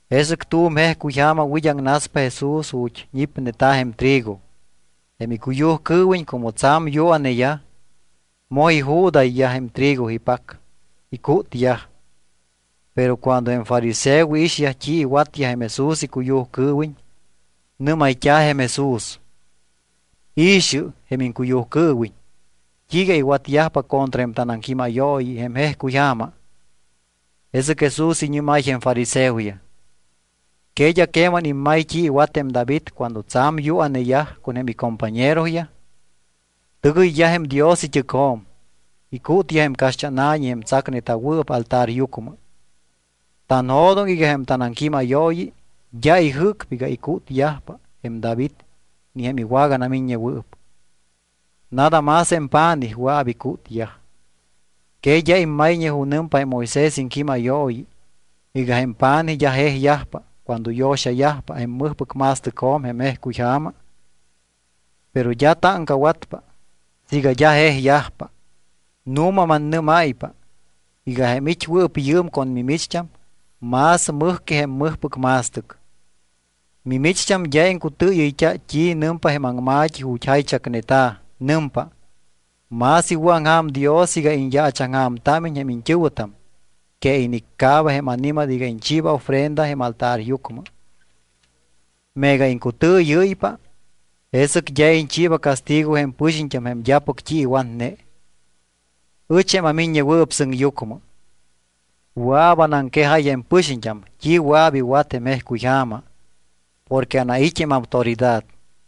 Jesɨc tu̱m jejcuy ja̱ma wid́aŋnaspa Jesús ju̱t́ ñipneta̱ jém trigo. Jém icuyujcɨɨwiñ como tsa̱m yua̱neyaj, moj iju̱dayyaj jém trigo ipac, icútyaj. Pero cuando jém fariseoyaj iixyaj t́i iwatyaj jém Jesús icuyujcɨɨwiñ, nɨ́mayt́a̱ jém Jesús: —I̱xɨ jém iŋcuyujcɨɨwiñ. ¿T́iiga iwatyajpa contra jém tanaŋquímayooyi jém jejcuy ja̱ma? Jesɨc Jesús iñɨ́máy jém fariseoyaj: —¿Que d́a queman immay t́i iwat jém David cuando tsa̱m yua̱neyaj con jém icompañeroyaj? Tɨgɨyyaj jém Dios it́ɨcjo̱m. Icútyaj jém caxt́ána̱ñi jém tsacneta̱wɨɨp altaryucmɨ. Tanjo̱doŋ iga jém tanaŋquímayooyi d́a ijɨ́cpa iga icútyajpa jém David ni jém iwaganamiññewɨɨp. Nada más jém pa̱nij wɨa̱p icútyaj. ¿Que d́a immayñe junɨmpa jém Moisés iŋquímayooyi iga jém pa̱nij d́a jejyajpa cuando yo̱xayajpa jém mɨjpɨc ma̱stɨcjo̱m jém jejcuyja̱ma? Pero d́a táŋcawatpa siiga d́a jejyajpa. Nu̱ma mannɨ́máypa iga jém it́wɨɨp yɨɨm con mimicht́am más mɨj que jém mɨjpɨc ma̱stɨc. Mimicht́am d́a iŋcutɨɨyɨyt́a t́i nɨmpa jém aŋma̱t́i ju̱t́ jaychacneta̱. Nɨmpa: “Más iwɨ̱aŋja̱m Dios iga iñyaachaŋja̱mtámiñ jém iñt́ɨ̱wɨtam que iniccaaba jém ani̱mat iga iñchiiba ofrenda jém altaryucmɨ.” Meega iŋcutɨɨyɨ́ypa, jesɨc d́a iñchiiba castigo jém pɨxiñt́am jém d́apɨc t́i iwatne. Ɨch, jém aMiññewɨɨp Sɨŋyucmɨ, wɨa̱p anaŋquejáy jém pɨxiñt́am t́i wɨa̱p iwat jém jejcuyja̱ma porque anait́ jém autoridad.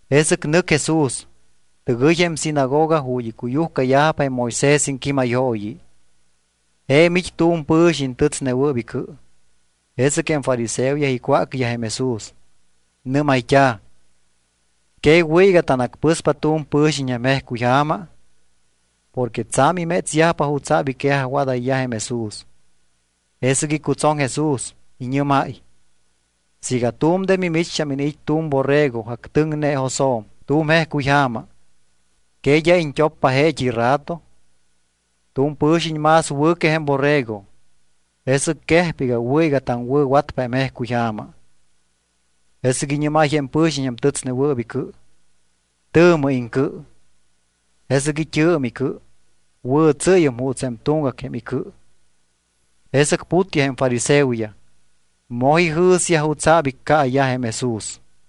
Jesɨc nɨc Jesús, tɨgɨy jém sinagoga ju̱t́ icuyujcayajpa jém Moisés iŋquímayooyi. Je̱m it́ tu̱m pɨ̱xiñ tɨtsnewɨɨp icɨ. Jesɨc jém fariseoyaj icwácyaj jém Jesús. Nɨ́mayt́a̱: —¿Que wɨ̱ iga tanacpɨspa tu̱m pɨ̱xiñ jém jejcuyja̱ma? Porque tsa̱m imétsyajpa jutsa̱p iquejajwadayyaj jém Jesús. Jesɨc icutsoŋ Jesús. Iñɨ́máy: —Siiga tu̱m de mimicht́am iniit́ tu̱m borrego actɨŋne josjo̱m tu̱m jejcuyja̱ma, ¿que d́a iñt́oppa jeet́i rato? Tu̱m pɨ̱xiñ más wɨ̱ que jém borrego. Jesɨc quejpa iga wɨ̱ iga taŋwɨ̱watpa jém jejcuyja̱ma. Jesɨc iñɨ́máy jém pɨ̱xiñ jém tɨtsnewɨɨp icɨ: —Tɨ̱mɨ iŋcɨ. Jesɨc it́ɨ̱m icɨ. Wɨ̱tsɨ́yum juuts jém tuŋgac jém icɨ. Jesɨc putyaj jém fariseoyaj. Moj ijɨ̱syaj jutsa̱p iccaayaj jém Jesús.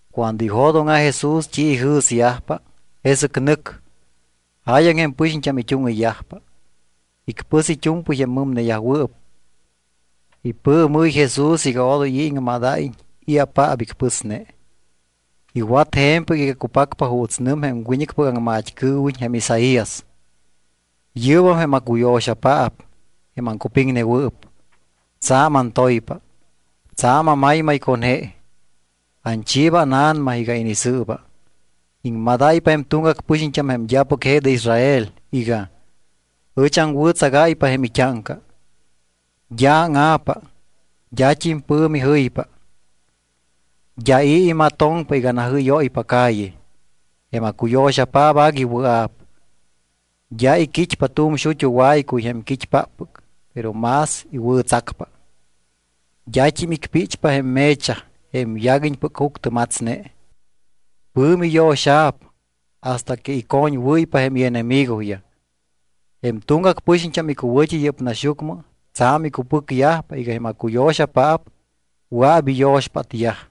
Cuando ijo̱dóŋa̱ Jesús t́i ijɨ̱syajpa, jesɨc nɨc. Jáyaŋ jém pɨxiñt́am it́úŋɨyyajpa. Icpɨs it́u̱mpɨy jém mɨmneyajwɨɨp. Ipɨɨmɨ́y Jesús iga odoy i̱ iŋmadayyajiñ i̱apaap icpɨsne. Iwat je̱mpɨc iga cupacpa juuts nɨm jém wiñɨcpɨc aŋmat́cɨɨwiñ jém Isaías: Yɨ́bam jém acuyo̱xapaap, jém aŋcupiŋnewɨɨp. Tsa̱m antoypa, tsa̱m amaymay con je. Anchiiba ánA̱nama iga inisɨɨba. Iŋmadáypa jém tuŋgac pɨxiñt́am jém d́apɨc je de Israel iga: Ɨch aŋwɨ̱tsagáypa jém it́áŋca. D́a áŋa̱pa, d́at́im pɨ̱mi jɨypa. D́a i̱ imatoŋpa iga najɨ́yóypa calle. Jém acuyo̱xapaap agui wɨa̱p. D́a iquit́pa tu̱m xut́u waycuy jém quit́páppɨc, pero más iwɨ̱tsacpa. D́at́im icpíchpa jém me̱chaj jém yaguiñpɨc juctɨmatsne. Pɨ̱mi yo̱xa̱p hasta que icoñwɨ́ypa jém ienemigoyaj. Jém tuŋgac pɨxiñt́am icuwɨ̱t́i yɨ́p naxyucmɨ tsa̱m icupɨcyajpa iga jém acuyo̱xapaap wɨa̱p iyo̱xpátyaj.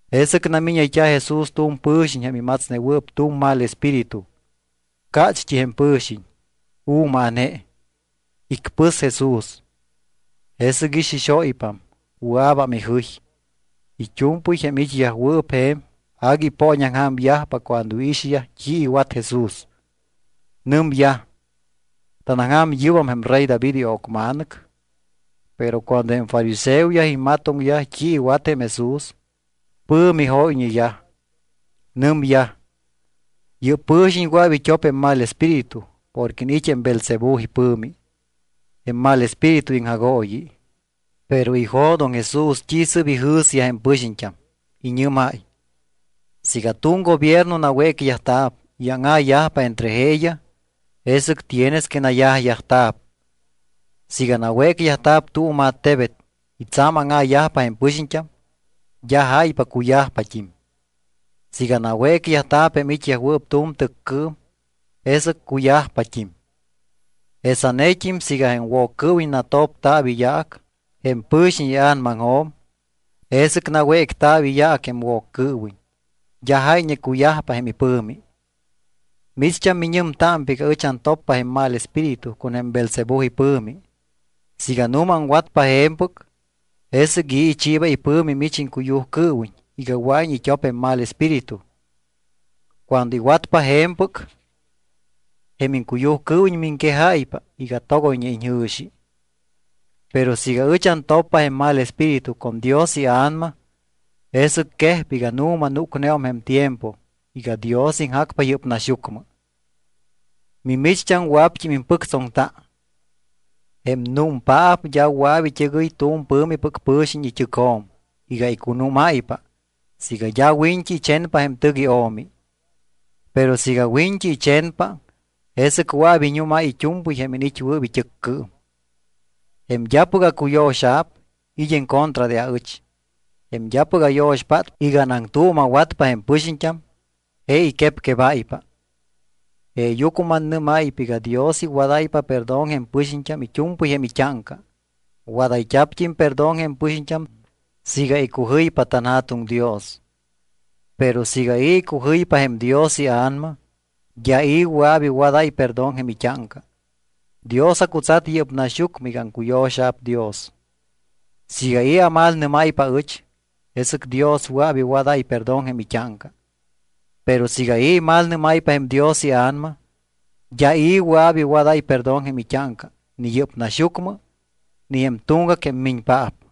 Jesɨc namíñayt́a̱ Jesús tu̱m pɨ̱xiñ jém imatsnewɨɨp tu̱m mal espíritu. Cácht́i jém pɨ̱xiñ, u̱maa̱ne. Icpɨs Jesús. Jesɨc ixixóypam, wɨa̱bam ijɨy. It́u̱mpɨy jém it́yajwɨɨp je̱m agui ipooñaŋja̱myaj cuando iixyaj t́i iwat Jesús. Nɨmyaj: —¿Tánaŋja̱m yɨ́bam jém rey David io̱cma̱nɨc? Pero cuando jém fariseoyaj imatoŋyaj t́i iwat jém Jesús, pɨ̱mi jóyñeyaj. Nɨmyaj: —Yɨ́p pɨ̱xiñ wɨa̱p it́op jém mal espíritu porque iniit́ jém Beelzebú ipɨ̱mi, jém mal espíritu iŋjagooyi. Pero ijo̱doŋ Jesús t́i sɨ́p ijɨ̱syaj jém pɨxiñt́am. Iñɨ́máy: —Siiga tu̱m gobierno nawécyajta̱p y áŋa̱yajpa entre jeeyaj, jesɨc tienes que nayajyajta̱p. Siiga nawécyajta̱p tu̱m attebet y tsa̱m áŋa̱yajpa jém pɨxiñt́am, d́a jáypa cuyajpat́im. Siiga nawécyajta̱p jém it́yajwɨɨp tu̱m tɨccɨɨm, jesɨc cuyajpat́im. Jesanet́im siiga jém Woccɨɨwiñ natopta̱p iyaac jém pɨ̱xiñ ia̱namaŋjo̱m, jesɨc nawécta̱p iyaac jém Woccɨɨwiñ. D́a jáyñe cuyajpa jém ipɨ̱mi. Micht́am miñɨmtámpa iga ɨch antoppa jém mal espíritu con jém Beelzebú ipɨ̱mi. Siiga nu̱ma aŋwatpa je̱mpɨc, ¿jesɨc i̱ ichiiba ipɨ̱mi mich iŋcuyujcɨɨwiñ iga wɨa̱iñ it́op jém mal espíritu? Cuando iwatpa je̱mpɨc, jém iŋcuyujcɨɨwiñ miŋquejáypa iga togoyñe iñjɨ̱xi. Pero siiga ɨch antoppa jém mal espíritu con Dios iA̱nama, jesɨc quejpa iga nu̱ma núcneum jém tiempo iga Dios iŋjacpa yɨ́p naxyucmɨ. Mimicht́am wɨa̱pt́im impɨctsoŋta. ’Jém númpaap d́a wɨa̱p it́ɨgɨy tu̱m pɨ̱mipɨc pɨ̱xiñ it́ɨcjo̱m iga icunúmáypa siiga d́a wiñt́i ichenpa jém tɨc io̱mi. Pero siiga wiñt́i ichenpa, jesɨc wɨa̱p iñúmáy it́u̱mpɨy jém iniit́wɨɨp it́ɨccɨɨm. ’Jém d́apɨc acuyo̱xa̱p it́ en contra de aɨch. Jém d́apɨc ayo̱xpátpa iga anaŋtuuma̱watpa jém pɨxiñt́am, je iquepquebáypa. ’Jeeyucmɨ mannɨ́máypa iga Dios iwadáypa perdón jém pɨxiñt́am it́u̱mpɨy jém it́áŋca. Wadayt́a̱pt́im perdón jém pɨxiñt́am siiga icujɨypa tanJa̱tuŋ Dios, pero siiga i̱ icujɨypa jém Dios iA̱nama, d́a i̱ wɨa̱p iwadáy perdón jém it́áŋca. Dios acutsat yɨ́p naxyucmɨ iga aŋcuyo̱xa̱p Dios. Siiga i̱ amalnɨ́máypa aɨch, jesɨc Dios wɨa̱p iwadáy perdón jém it́áŋca. Pero siiga i̱ imalnɨ́máypa jém Dios iA̱nama, d́a i̱ wɨa̱p iwadáy perdón jém it́áŋca ni yɨ́p naxyucmɨ ni jém tuŋgac jém miñpaap.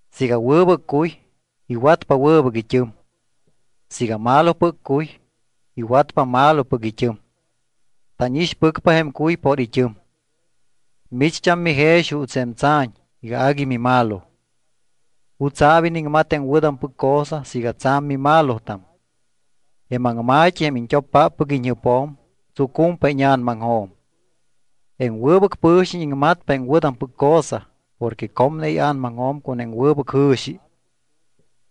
’Siiga wɨbɨc cuy, iwatpa wɨbɨc it́ɨm. Siiga malopɨc cuy, iwatpa malopɨc it́ɨm. Tánixpɨcpa jém cuy por it́ɨm. Micht́am mijex juuts jém tsa̱ñ iga agui mimalo. ¿Jutsa̱p iniŋmat jém wɨ̱tampɨc cosa siiga tsa̱m mimalotam? Jém aŋma̱t́i jém iñt́oppáppɨc iñjɨpjo̱m, tsucumpa íña̱namaŋjo̱m. Jém wɨbɨc pɨ̱xiñ iŋmatpa jém wɨ̱tampɨc cosa porque comne ia̱namaŋjo̱m con jém wɨbɨc jɨ̱xi.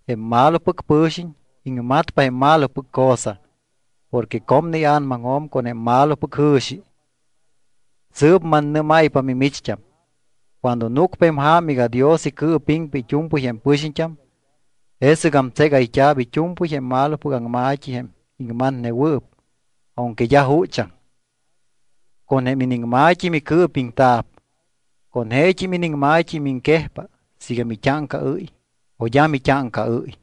Jém malopɨc pɨ̱xiñ iŋmatpa jém malopɨc cosa porque comne ia̱namaŋjo̱m con jém malopɨc jɨ̱xi. Sɨɨp mannɨ́máypa mimicht́am, cuando núcpa jém ja̱ma iga Dios icɨɨpiŋpa it́u̱mpɨy jém pɨxiñt́am, jesɨgam tségayt́a̱p it́u̱mpɨy jém malopɨc aŋma̱t́i jém iŋmatnewɨɨp aunque d́a juchaŋ. Con jém iniŋma̱t́i micɨɨpiŋta̱p, con jeet́im iniŋma̱t́i miŋquejpa siiga mit́áŋcaɨ́y o d́a mit́áŋcaɨ́y.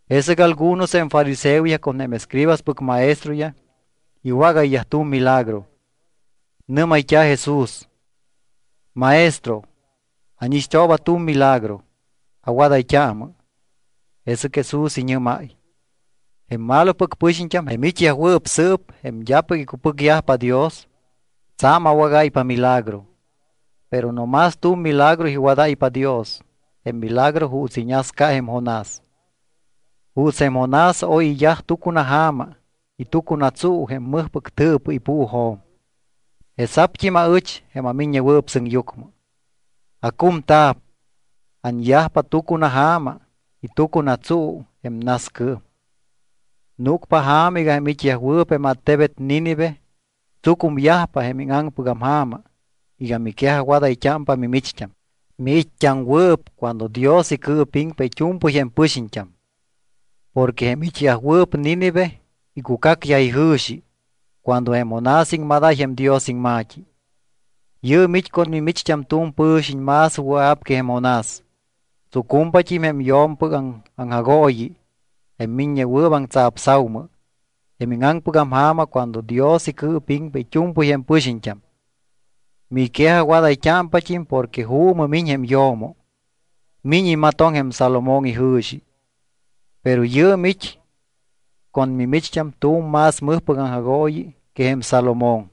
Jesɨc algunos jém fariseoyaj con jém escribaspɨc maestroyaj iwágayyaj tu̱m milagro. Nɨ́mayt́a̱ Jesús: —Maestro, ánixt́ooba tu̱m milagro, awadayt́aamɨ. Jesɨc Jesús iñɨ́máy: —Jém malopɨc pɨxiñt́am, jém it́yajwɨɨp sɨɨp jém d́apɨc icupɨcyajpa Dios, tsa̱m awágáypa milagro. Pero no más tu̱m milagro iwadáypa Dios, jém milagro juuts iñasca jém Jonás. Juuts jém Jonás oy iyaj tucunaja̱ma y tucunatsuu jém mɨjpɨc tɨɨpɨ ipuujo̱m, jesa̱pt́im aɨch, jém aMiññewɨɨp Sɨŋyucmɨ, acumta̱p, anyajpa tucunaja̱ma y tucunatsuu jém nascɨɨm. Núcpa ja̱ma iga jém it́yajwɨɨp jém attebet Nínive tsucumyajpa jém íŋaŋpɨgam ja̱ma iga miquejajwadayt́ámpa mimicht́am, miit́t́aŋwɨɨp cuando Dios icɨɨpiŋpa it́u̱mpɨy jém pɨxiñt́am. Porque jém it́yajwɨɨp Nínive icucacyaj ijɨ̱xi cuando jém Jonás iŋmadáy jém Dios iŋma̱t́i. Yɨɨm it́ con mimicht́am tu̱m pɨ̱xiñ más wɨa̱p que jém Jonás. Tsucumpat́im jém yo̱mpɨc aŋjagooyi jém miññewɨɨp aŋtsapsa̱umɨ jém íŋaŋpɨgam ja̱ma cuando Dios icɨɨpiŋpa it́u̱mpɨy jém pɨxiñt́am. Miquejajwadayt́ámpat́im porque juumɨ miñ jém yo̱mo. Miñ imatoŋ jém Salomón ijɨ̱xi, pero yɨɨm it́ con mimicht́am tu̱m más mɨjpɨc aŋjagooyi que jém Salomón.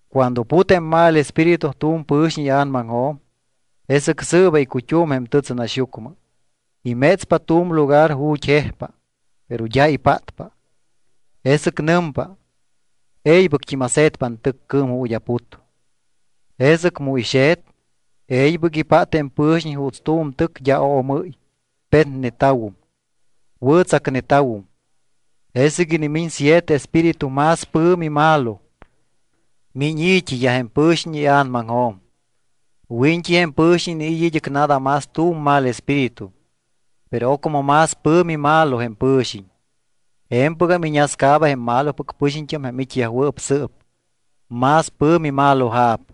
’Cuando put jém mal espíritu tu̱m pɨ̱xiñ ia̱namaŋjo̱m, jesɨc sɨɨba icut́um jém tɨtsɨnaxyucmɨ. Imétspa tu̱m lugar ju̱t́ jejpa. Pero d́a ipátpa. Jesɨc nɨmpa: “E̱ybɨct́im ase̱tpa antɨccɨɨm ju̱t́ aput.” Jesɨc mu ixe̱t, e̱ybɨc ipát jém pɨ̱xiñ juuts tu̱m tɨc d́a oomɨ́y, petneta̱wum, wɨ̱tsacneta̱wum. Jesɨc inimiñ siete espíritu más pɨ̱mi malo. Miñ i̱t́iyaj jém pɨ̱xiñ ia̱namaŋjo̱m. Wiñt́i jém pɨ̱xiñ iniit́ id́ɨc nada más tu̱m mal espíritu, pero ocmɨ más pɨ̱mi malo jém pɨ̱xiñ. Je̱mpɨgam iñascaaba jém malopɨc pɨxiñt́am jém it́yajwɨɨp sɨɨp. Más pɨ̱mi maloja̱p.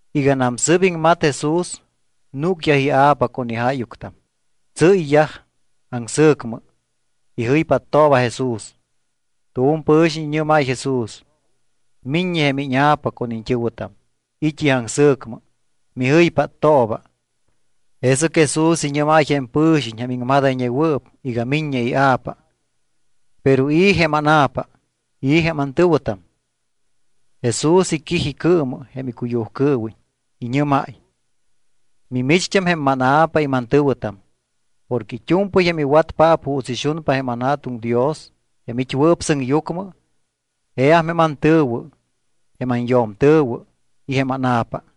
Iganam sɨ́p iŋmat Jesús, núcyaj ia̱pa con ijáyuctam. Tsɨ́yyaj aŋsɨ̱cmɨ. Ijɨypáttooba Jesús. Tu̱m pɨ̱xiñ iñɨ́máy Jesús: —Miññe jém íña̱pa con iñt́ɨ̱wɨtam, it́yaj aŋsɨ̱cmɨ. Mijɨypáttooba. Jesɨc Jesús iñɨ́máy jém pɨ̱xiñ jém iŋmadayñewɨɨp iga miññe ia̱pa: —¿Pero i̱ jém ána̱pa? ¿I̱ jém antɨ̱wɨtam? Jesús iquij icɨɨmɨ jém icuyujcɨɨwiñ, iñɨ́máy: —Mimicht́am jém mána̱pa y mantɨ̱wɨtam. Porque it́u̱mpɨy jém iwatpaap juuts ixunpa jém anJa̱tuŋ Dios jém it́wɨɨp sɨŋyucmɨ, jeam jém antɨ̱wɨ, jém anyo̱mtɨ̱wɨ y jém ána̱pa.